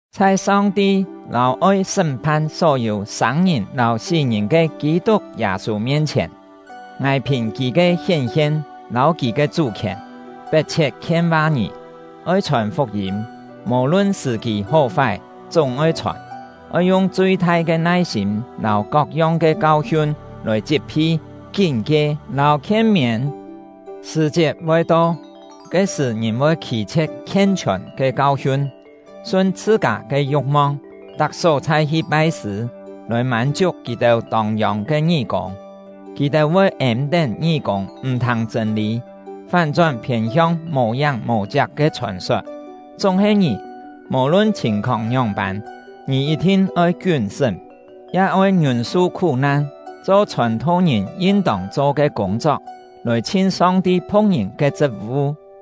Chhai Song-ti lâu oi sṳ́m-phan só-yû sâng-ngìn lâu sí-ngìn ke Kî-tuk Yâ-sû mien-chhièn, ngài phìn kì ke hién-hien lâu kì ke chú-khièn, pet-chhiet khien-va ngì: Oi chhòn fuk-yîm, mò-lun sṳ̀-kî hó-fái chúng-oi chhòn! Oi yung chui-thai ke nai-sîm lâu kok-yong ke kau-hiun lòi chit-phi, kín-kie, lâu khien-miên. Sṳ̀-chiet voi to, ke-sṳ̀ ngìn voi khî-chhie̍t khien-chhiòn ke kau-hiun, sun chhṳ-kâ ke yu̍k-mong, tak só-chhai hi pai-sṳ̂, lòi mân-chiuk kì-têu tông yông ke ngí-kûng. Kì-têu voi êm-tén ngí-kûng m̀-thâng chṳ̂n-lî, fán-chón phiên-hiong mò-yáng mò-chiak ke chhòn-sot. Chúng-he ngì, mò-lun chhìn-khóng ngióng-pân, ngì yit-thin oi kiún-sṳ́m, ya oi ngiûn-su khú-nan, cho chhòn-tho-ngìn yin-tông cho ke kûng-chok, lòi chhin Song-ti phu̍k-ngìn ke chṳt-vu.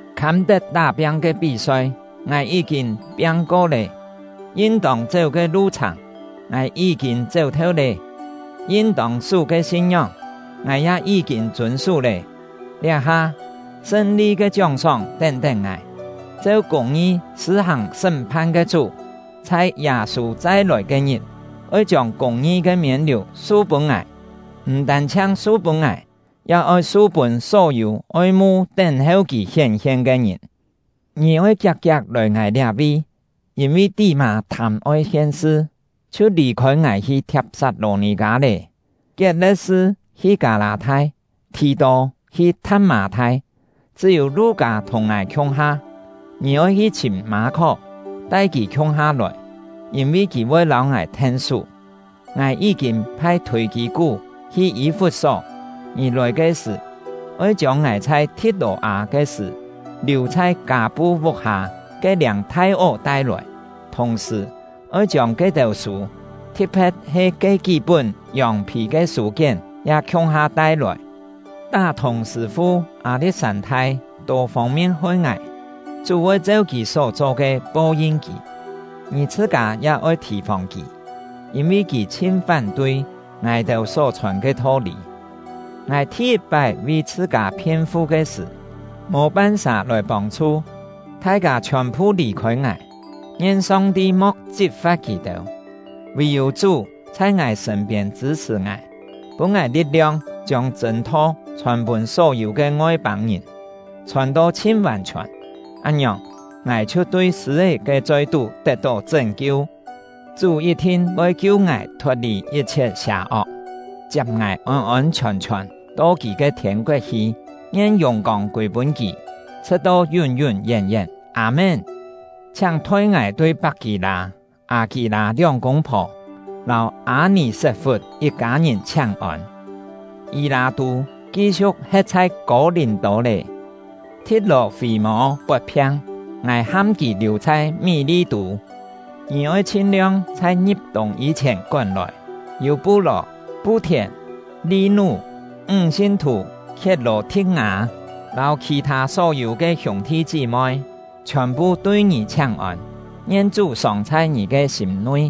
Khâm-tet tá-piang ke pí-soi, ngài yí-kîn piang-ko lé; yin-tông chéu ke lu-chhàng, ngài yí-kîn chéu-theu lé; yin-tông sú ke sin-ngióng, ngài ya yí-kîn chûn-sú lé. Liá-ha, sṳn-li ke chióng-sóng tén-tén ngài; cheu kûng-ngi sṳ̂-hàng sṳ́m-phan ke Chú, chhai Yâ-sû chai-lòi ke-ngit, oi chiông kûng-ngi ke miên-liù su-pûn ngài, m̀ tân-chhiang su-pûn ngài, ya oi su-pûn só-yû oi-mu tén-heu kì hién-hien ke ngìn. Ngì oi kiak-kiak lòi ngài liá-vi. Yîn-vi Tí-mâ thâm-oi hien-sṳ, chhiu lì-khôi ngài hi Thiap-sat-lò-nì-kâ lé. Kiet-le̍t-sṳ hi Kâ-lâ-thai, Thì-tô hi Tha̍t-mâ-thai; chṳ́-yû Lu-kâ thùng ngài khiung-ha. Ngì oi hi chhìm Mâ-khó, tai kì khiung-ha lòi, yîn-vi kì voi lâu ngài then-sú. Ngài yí-kîn phai Thûi-kî-kú hi Yî-fut-só. Ngì lòi ke sṳ̀, oi chiông ngài chhai Thi̍t-lò-â ke sṳ̀ liù chhai Kâ-pu vuk-hâ ke-liâng thai-ó tai-lòi; thùng-sṳ̀, oi chiông ke-têu sû, thi̍t-phe̍t he ke kí-pún yòng-phì ke sû-kién ya khiung-ha tai-lòi. Tá-thùng sṳ̂-fu Â-li̍t-sân-thai tô fông-mien hoi ngài; Chú voi cheu kì só-cho ke po-yin kì. Ngì chhṳ-kâ ya oi thì-fòng kì, yîn-vi kì chhin fán-tui ngài-têu só-chhòn ke tho-lî. Ngài thi-yit-pái vi chhṳ-kâ phien-fu ke sṳ̀, mò pan-sà lòi pông-chhu, thai-kâ chhiòn-phu lì-khôi ngài. Ngien Song-ti mo̍k chit-fa̍t kì-têu! Vì-yû Chú chhai ngài sṳ̂n-piên chṳ̂-chhṳ̀ ngài, pûn ngài li̍t-liong chiông chṳ̂n-tho chhòn-pûn só-yû ke Ngoi-pâng-ngìn, chhòn-to chhin vàn-chhiòn; án-ngiòng, ngài chhiu tui sṳ̂-é ke choi-tú tet-tó chṳ́n-kiu. Chú yit-thin voi kiu ngài thot-lì yit-chhiet sià-ok, chiap ngài ôn-ôn chhiòn-chhiòn to kì ke thiên-koet hi. Ngien yùng-kông kûi-pûn kì, chhṳ̍t-to yún-yún yén-yén! Â-mén. Chhiáng thoi ngài tui Pak-kî-lâ, Â-kî-lâ lióng kûng-phò, lâu Â-nì-set-fut yit-kâ ngìn chhiáng-ôn. Yî-lâ-tû ki-siu̍k he̍t chhai Kô-lìm-tô lé. Thi̍t-lò-fî-mô pot-phiang, ngài ham kì liù chhai Mí-li-tû. Ngì oi chhin-liong chhai ngi̍p-tûng yî-chhièn kón-lòi. Yû-pu-lò, Pu-thièn, Li-nú, ńg sin-thù Khiet-lò-thi̍t-ngâ, lâu khì-thâ só-yû ke hiûng-thi chí-moi chhiòn-phu tui ngì chhiáng-ôn. Ngien Chú sòng chhai ngì sîm-nui!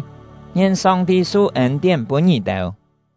Ngien Song-ti su ên-tién pûn ngì-têu!